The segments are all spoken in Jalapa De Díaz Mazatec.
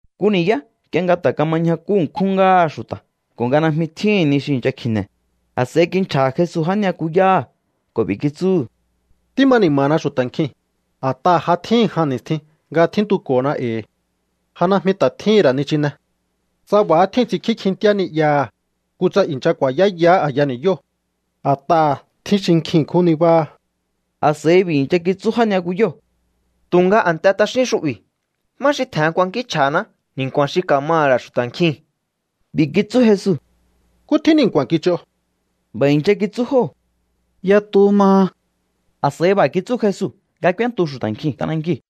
Nku ni̱yá nk'ie nga ta̱ kama ñjakú ṉkjúhún ngáha xu̱ta̱ ko̱ nga najmi tjíhi̱n ni xi i̱ncha kji̱ne̱, a̱s'a̱i kinchja̱ha̱ Jesu já ni'yakuyáha̱ ko̱ b'i̱ kitsúhu̱: —Tíma ni̱ma̱na xu̱ta̱ nkjii̱n, a̱t'aha̱ ja tjíhi̱n jan ni̱stjin nga tjíntuko̱na e̱i̱. Ja najmi ta̱ tjíhi̱n ra̱ nichine. Tsa b'a̱há tjíu̱n ts'inkjí kjintíá ni'yaha̱, kutsa i̱ncha ku̱a̱yáyahá a̱ya ni̱yóo̱. A̱t'aha̱ tjín xi kjin ṉkjún nibáha. A̱s'a̱i b'i̱ i̱ncha kitsú já ni'yakuyóo̱: —Tu̱nga a̱nte t'axín xu'bi̱. ¿Má xi tje̱hen kuankínchj'a̱haná ni̱nku̱a̱n xi ka̱maha̱ ra̱ xu̱ta̱ nkjii̱n? B'i̱ kitsú Jesu: —¿Nkú tjín ni̱nku̱a̱n kich'o? B'a̱ i̱ncha kitsú jóo̱: —Yatu maha. A̱s'a̱i b'a̱ kitsú Jesu nga k'úéntu xu̱ta̱ nkjiu̱n t'anankiu̱.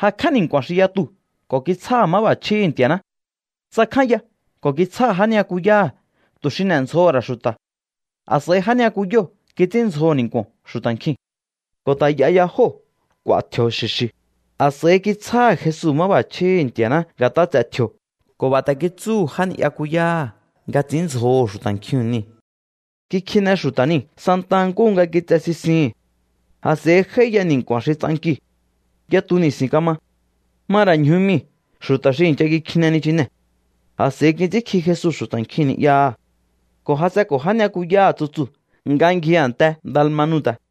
Jakj'á ni̱nku̱a̱n xi yatuu̱ ko̱ kitsjáha̱ máb'a̱chjíhi̱ Nti̱a̱ná. Tsakjánya ko̱ kitsjáha̱ já ni'yakuyáha̱ tu̱ xi n'e̱ndzjoho̱ ra̱ xu̱ta̱. A̱s'a̱i já ni'yakuyóo̱ kits'ínndzjoho̱ ni̱nku̱o̱n xu̱ta̱ nkjiu̱n. Ko̱ ta̱ y'a ya jóo̱ k'u̱a̱ tji̱o̱ xi̱xi̱. A̱s'a̱i kitsjáha̱ Jesu máb'a̱chjíhi̱ Nti̱a̱ná nga̱t'a ts'e̱ tji̱o̱ ko̱ b'a̱ ta̱ kitsúhu̱ já ni'yakuyáha̱ nga ts'i̱ínndzjoho̱ xu̱ta̱ nkjiu̱n niu̱. Kikjine xu̱ta̱ niu̱ santa nkúhu nga kitse sisihi̱n. A̱s'a̱i j'áíya ni̱nku̱a̱n xi ts'ankiu̱. Yatu ni̱si̱n kama. Ma ra̱ ñju mii̱ xu̱ta̱ xi i̱ncha kikjine nichinee̱. A̱s'a̱i kits'ínkji Jesu xu̱ta̱ nkjiu̱n ni'yaha̱ ko̱ jas'enko̱ já ni'yakuyáha̱ tsutsuu̱ nga ngji a̱nte Dalmanuta̱.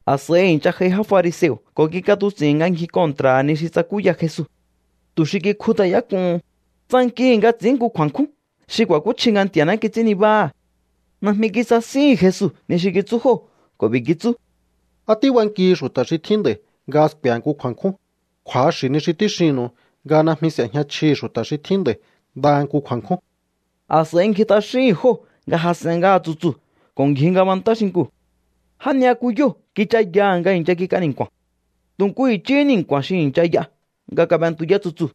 A̱s'a̱i i̱ncha j'ai já fariseo̱ ko̱ kik'atuts'i̱hi̱n nga ngji kontra̱ha̱ ni xi tsakúya Jesu. Tu̱ xi kikjut'ayák'uhun, tsankihi̱ nga ts'i̱ín nku kju̱a̱nkjún xi ku̱a̱kúchji nga Nti̱a̱ná kits'ín nibáha̱. Najmi kisasíhi̱n Jesu ni xi kitsú jóo̱ ko̱ b'i̱ kitsú: —¿Á tíbankihi xu̱ta̱ xi tjíhin nd'a̱i̱ nga sku̱e̱he nku kju̱a̱nkjún? Kju̱axi̱ ni xi tíxinnu̱u nga najmi s'e̱jña chjihi̱ xu̱ta̱ xi tjín nd'a̱i̱ ndaha nku kju̱a̱nkjún. A̱s'a̱i ngji t'axíhi̱n jóo̱ nga jas'en ngáha tsutsuu̱ ko̱ ngji ngabantá xinkuu̱. Já ni'yakuyóo̱ kichayaha̱ nga i̱ncha kik'a ni̱nku̱a̱n. Tu̱ nku i̱chíhí ni̱nku̱a̱n xi i̱ncha y'a nga kab'entuyá tsutsuu̱.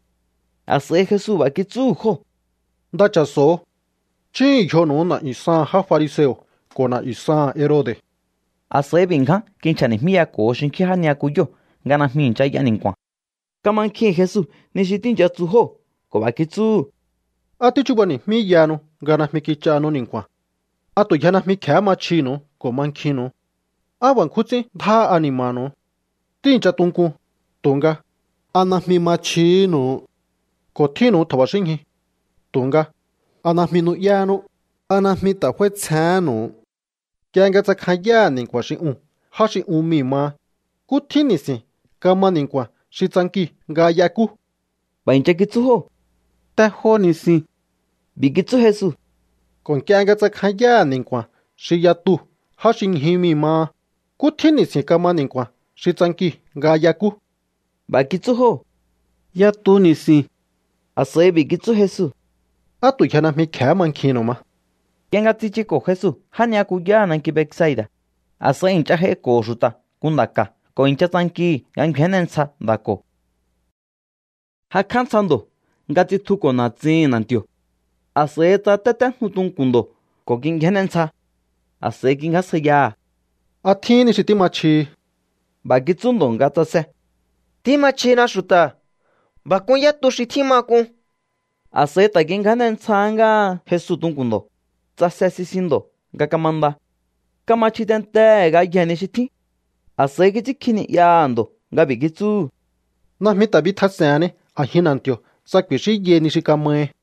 A̱s'a̱i Jesu b'a̱ kitsúhu̱ jóo̱: —Nda cha̱so̱o. Chúhu̱un yjonu̱u na̱'yu̱ saha̱n já fariseo̱ ko̱ na̱'yu̱ saha̱n Herode̱. A̱s'a̱i b'i̱ ngján kinchja̱ni̱jmíyako̱ho xinkjín já ni'yakuyóo̱ nga najmi i̱ncha y'a ni̱nku̱a̱n. Kamankjihi̱n Jesu ni xi tíi̱ncha tsu jóo̱ ko̱ b'a̱ kitsúhu̱: —¿Á tíchubani̱jmíyahanu nga najmi kich'ahanu ni̱nku̱a̱n? ¿A tu̱ yje najmi kje̱hé ma chjinu̱u ko̱ mankjinnu̱u? ¡Á b'a̱ nkjún ts'ín ndjáha ani̱ma̱nu̱u! Tíi̱ncha tunkun, tu̱nga, ¿a najmi ma chjihínu̱u? Ko̱ tjínnu̱u tja̱ba̱xínñju, tu̱nga, ¿a najmi nu'yánú? ¿A najmi ta̱ f'áítsjehénnu̱u? Nk'ie nga tsakjanyáha̱ ni̱nku̱a̱n xi uu̱n já xi un mii̱ maha, ¿nkú tjín ni̱si̱n kama ni̱nku̱a̱n xi tsankiu̱ nga y'ekú? B'a̱ i̱ncha kitsú jóo̱: —Te jo ni̱si̱n. B'i̱ kitsú Jesu: —Ko̱ nk'ie nga tsakjanyáha̱ ni̱nku̱a̱n xi yatuu̱ já xi ñju mii̱ maha, ¿nkú tjín ni̱si̱n kama ni̱nku̱a̱n xi tsankiu̱ nga y'ekú? B'a̱ kitsú jóo̱: —Yatu ni̱si̱n. A̱s'a̱i b'i̱ kitsú Jesu: —¿Á tu̱ yje najmi kje̱hé mankjihi̱nnu̱u ma? Nk'ie nga tsichuko̱ Jesu já ni'yakuyáha̱ nanki Betsaida̱, a̱s'a̱i i̱ncha j'aiko̱ho̱ xu̱ta̱ nku nda̱ ka̱ ko̱ i̱ncha tsankihi̱ nga ngju̱áne ntsja nda̱ ko̱. Jakj'á ntsja ndo̱ nga tsitjuko̱ na̱tsihi̱n na̱nti̱o̱. A̱s'a̱i tsáta̱téjnu tunku̱n ndo̱ ko̱ kingjáne ntsja. A̱s'a̱i kingjásjaiyaha̱: —¿A tjín ni xi tíma chjihi? B'a̱ kitsú ndo̱ nga tsase: —Tíma chjina xu̱ta̱. B'a̱ k'un yá tu xi tjíma k'un. A̱s'a̱i ta̱ kingjáne ntsja ngáha Jesu tunku̱n ndo̱. Tsase sisin ndo̱ nga kamanda. Kama chji tentehe̱ ngayjee̱ ni xi tjín. A̱s'a̱i kits'ínkji ni'yaha̱ ndo̱ nga b'i̱ kitsúhu̱: —Najmi ta̱ bitjas'e̱henni a̱jin na̱nti̱o̱ tsa ku̱i̱xínyai ni xi kamahi.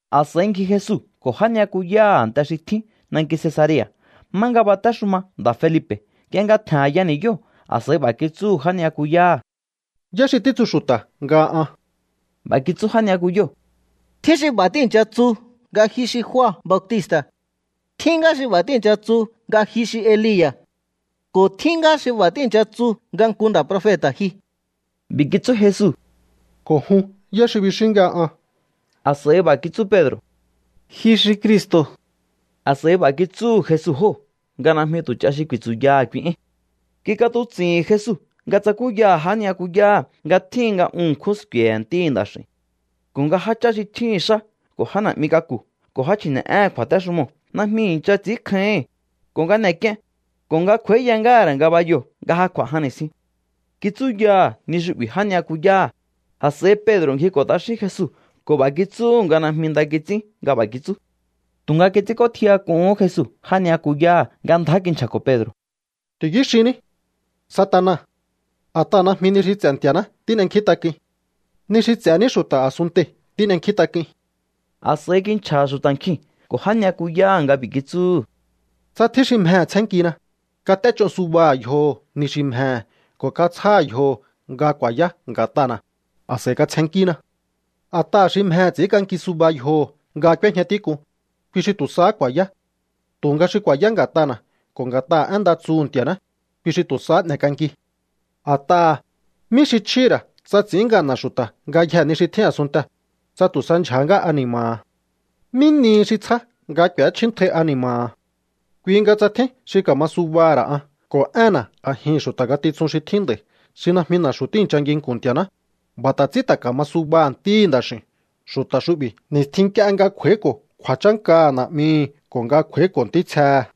A̱s'a̱i ngji Jesu ko̱ já ni'yakuyáha̱ a̱nte xi tjín nanki Cesarea̱, má nga batéxuma nda̱ Felipe̱. Nk'ie nga tje̱n a̱ya ni̱yóo̱, a̱s'a̱i b'a̱ kitsúhu̱ já ni'yakuyáha̱: —¿Yá xi títsu xu̱ta̱ nga an? B'a̱ kitsú já ni'yakuyóo̱: —Tjín xi b'a̱ tíi̱ncha tsu nga ji xi Jua Bautista̱. Tjín ngá xi b'a̱ tíi̱ncha tsu nga ji xi Elia̱. Ko̱ tjín ngá xi b'a̱ tíi̱ncha tsu nga nku nda̱ profeta̱ ji. B'i̱ kitsú Jesu: —Ko̱ jun, ¿yá xi bixíún nga an? A̱s'a̱i b'a̱ kitsú Pedro̱: —Ji xi Cristo̱. A̱s'a̱i b'a̱ kitsúhu̱ Jesu jóo̱ nga najmi tu̱ ch'a xi ku̱i̱tsu̱yaha̱ kui éi̱n. Kik'atuts'i̱hi̱n Jesu nga tsakúyaha̱ já ni'yakuyáha̱ nga tjíhin nga un ṉkjún sku̱e̱he̱ Ntíhi̱ Nda̱x'i̱u̱n, ko̱ nga jáchá xi tjíhi̱n xá ko̱ já na̱'mi k'aku̱ ko̱ já chji̱ne̱'éhe̱n kju̱a̱téxumoo̱ najmi i̱ncha ts'i̱ínkjáíhi̱n, ko̱ nga n'e̱k'ien, ko̱ nga kj'u̱a̱íya ngáha̱ ra̱ ngabayoo̱ nga ja kj'u̱a̱ jan ni̱stjin. Kitsúyaha̱ ni xu'bi̱ já ni'yakuyáha̱. A̱s'a̱i Pedro̱ ngjiko̱ t'axín Jesu ko̱ b'a̱ kitsúhu̱ nga najmi nda kits'ín nga b'a̱ kitsú. Tu̱nga kits'ínk'ótjiyak'uhún Jesu já ni'yakuyáha̱ nga ndjá kinchja̱ko̱ Pedro̱: —¡Ti̱yú xinní, Satana! A̱t'aha̱ najmi ni xi ts'e̱ Nti̱a̱ná tín'enkjíntak'uin. Ni xi ts'e̱ ní xu̱ta̱ a̱sunntei̱ tín'enkjíntak'uin. A̱s'a̱i kinchja̱ha̱ xu̱ta̱ nkjiu̱n ko̱ já ni'yakuyáha̱ nga b'i̱ kitsúhu̱: —Tsa tjín xi mjehe̱ tsjénnkina, kat'éch'o subaha̱ yjoho̱ ni xi mjehe̱ ko̱ katsjáha̱ yjoho̱ nga ku̱a̱yá nga̱t'ana̱, a̱s'a̱i katsjennkína. A̱t'aha̱ xi mjehe̱ ts'i̱ínk'anki suba yjoho̱ nga k'úéjña tík'un, kui xi tu̱ sahá ku̱a̱yá. Tu̱nga xi ku̱a̱yá nga̱t'ana̱ ko̱ nga̱t'aha̱ én nda tsuhu̱ Nti̱a̱ná, kui xi tu̱ sahá n'e̱k'anki. A̱t'aha̱, ¿mí xi chjíhi̱ ra̱ tsa ts'i̱ín ngana̱ xu̱ta̱ ngayjee̱ ni xi tjín a̱sunntee̱, tsa tu̱ sa ndyja̱há ngá ani̱ma̱ha̱? ¿Mí nihi xi tsjá nga k'u̱échjíntjai ani̱ma̱ha̱? ’Kui nga tsa tjín xi ka̱ma subaha̱ ra̱ an ko̱ énna̱ a̱jihi̱n xu̱ta̱ ngatitsun xi tjín nd'a̱i̱ xi najmi na̱xu̱ tíi̱ncha nginku̱n Nti̱a̱ná, b'a̱ ta̱ ts'ín ta̱ ka̱ma subaha̱ Ntíhi̱ Nda̱x'i̱u̱n xu̱ta̱ xu'bi̱ ni̱stjin nk'ie nga kj'u̱a̱íko̱ kju̱a̱chánkaha̱ Na̱'mihi̱ ko̱ nga kj'u̱a̱íko̱ ntítsjehe̱.